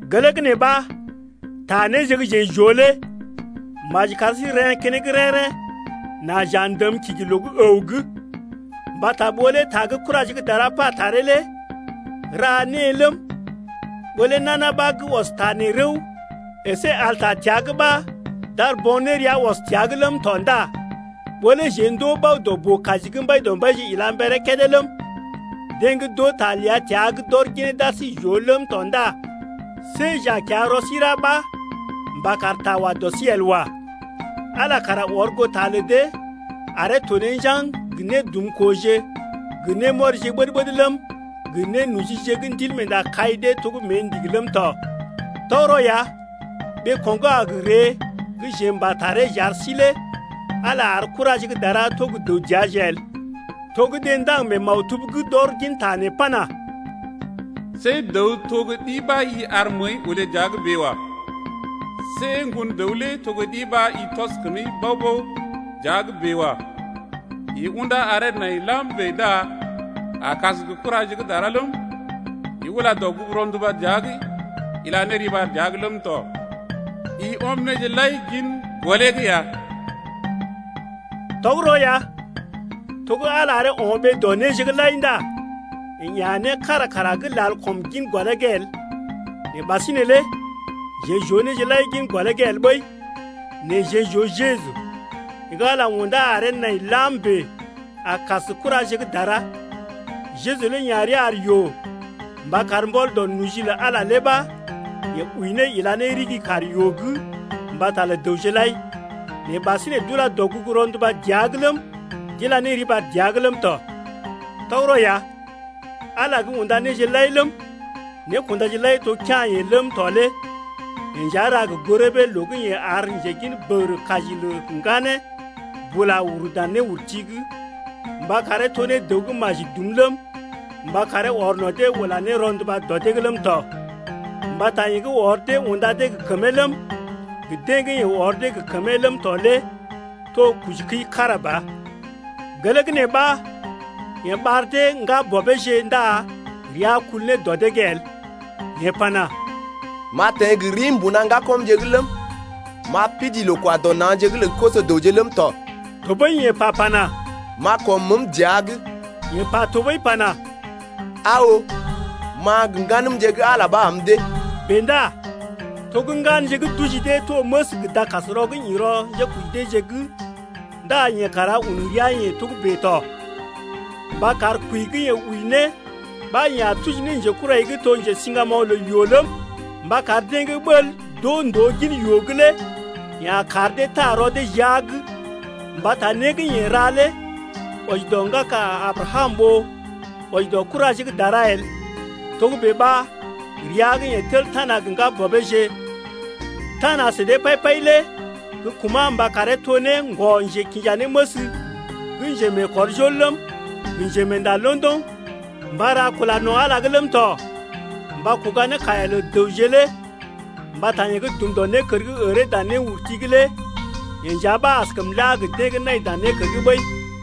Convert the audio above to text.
Gelee gə́ nee ɓa ta néje gə́ jeḛ j’oo lé maji kar sí n’reḛ́ keneŋ rḛ́-rḛ́ nà j’a ndəm kigi loo gə́ əw’g. Mbata ɓó lé ta gə́ kuraje gə́ dara pa taree lé ra née ləm, ɓó lé nana ɓa gə́ ɔs ta nee rəw əsé al ta təa’g ɓa d’ar bo̰ nérea ɔs təa’g ləm tɔ ndá ɓó lé jeḛ ndoo bao dɔ boo-kaji gə́ Mbaidɔmbaije ila mberee kédé ləm, deḛ gə́ d’oo ta ləa təa’g d’ɔr ginee d’ar sí j’oo ləm tɔ ndá see j’a kiya rɔ sí ra ɓa mba kar ta wa dɔ sí el wa. Ala kara ɔr goo ta lə dee aree to ne njaŋg gə nédumkooje gə némɔrije ɓəd-ɓəd ləm, gə nénojije gə́ Ndilmeenda kai dee to gə́ mée ndigi ləm tɔ. Tɔgərɔ ya ɓeeko̰ gə́ a gə ree gə́ jeḛ m’pa taree j’ar sí lé Ala ar kuraje gə́ dara to gə́ dəw dəaje el. To gə́ deḛ ndaŋg mee maktub’g d’ɔr ginta nee pana: See dəw to gə́ ɗi ɓa i ar məəi olé dəa’g bèe wa. See ŋgon dəw lé to gə́ ɗi ɓa i tɔs kəmi bao-bao dəa’g bèe wa. I undá aree nai lam bèe ndá a kas gə kuraje gə́ dara ləm, I ula dɔgugu rɔnduba dəa’g ila ne riɓar ne dəa’g ləm tɔ. I ɔm néje lai-lai gin gɔlee’g ya. Tɔgərɔ ya, to gə́ Ala aree o̰ ɓee dɔ néje’g lai ndá yeḛ ya̰ né kára kara gə́ lal kɔm gin gɔlee’g el nɛ ɓasinè lé jeḛ j’oo néje lai gin gɔlee’g el ɓəi. Nɛ jeḛ j’oo Jeju, yeḛ gə́ Ala undá aree nai lam bèe a kas kuraje gə́ dara. Jeju lé ya̰ rəa ar yoo mba kar mbɔl dɔ noji lə Ala lé ɓa yeḛ wəi ne ila ne ɗigi kaar yoo’g mbata lə dəwje lai. Nɛ ɓasinè d’ula dɔgugu rɔnduba dəa’g ləm, d’ila ne riɓar dəa’g ləm tɔ. Tɔgərɔ ya, Ala gə́ unda néje lai ləm, nékundaje lai to kea̰-yeḛ ləm tɔ lé yeḛ nja ra gə goo rəbee loo gə́ yeḛ ar njegin bəgərə kaji lə ŋganee bula uru dan néurti’g, mba karee to ne dəw gə́ maji dum ləm, mba karee ɔr no̰ dee ula ne rɔnduba dɔ dee’g ləm tɔ. Mbata yeḛ gə́ ɔr dee unda dee gə kəmee ləm, gə deḛ gə́ yeḛ ɔr dee gə kəmee ləm tɔ lé to kojikəi kára ba. Gelee gə́ nee ɓa yeḛ ɓar dee ne ŋgabɔbeeje ndá rəa kul ne dɔ dee’g el. Yeḛ pana: M’a teḛ gə rii mbuna ŋgakɔmje’g ləm, M’a pidii loo-kwa-dɔ-na̰’g lə koso-dəwje ləm tɔ. Tɔɓəi yeḛ pa pana: M’a kɔm məəm dəa’g. Yeḛ pa tɔɓəi pana: Aa oo, ma gə ŋganəmje gə́ Ala ɓa am dee. Bèe ndá to gə́ ŋganje gə́ d’oji dee to məs gə dakasrɔ gə́ ḭ rɔ njékoji deeje’g ndá yeḛ kara un rəa-yeḛ togə́bè tɔ mba kar kwəi gə́ yeḛ wəi ne ɓa yeḛ a tuji ne njekurai gə́ to njesiŋgamoŋ lə yoo ləm, mba kar deḛ gə́ ɓəl d’oo ndòo gin yoo’g lé yeḛ a kar dee taa rɔ dee jia’g. Mbata né gə́ yeḛ ra lé wɔji dɔ ŋgaka Abrakam ɓó wɔji dɔ kuraje gə́ dara el. Togə́bè ɓa, rəa gə́ yeḛ tel tana gə ŋgabɔbeeje, tana sə dee pai-pai lé gə́ kuma̰ mba karee to ne ŋgɔ-njekinjanéməs gə́ njemeekɔrjol ləm, gə njemeenda londoŋ mba ra kula no̰ Ala’g ləm tɔ mba kuga ne kaiya lə dəwje lé. Mbata yeḛ gə́ dum dɔ nékər gə́ əree dan néurti’g lé yeḛ nja ɓa askəm la gə deḛ gə́ nai dan nékər’g ɓəi.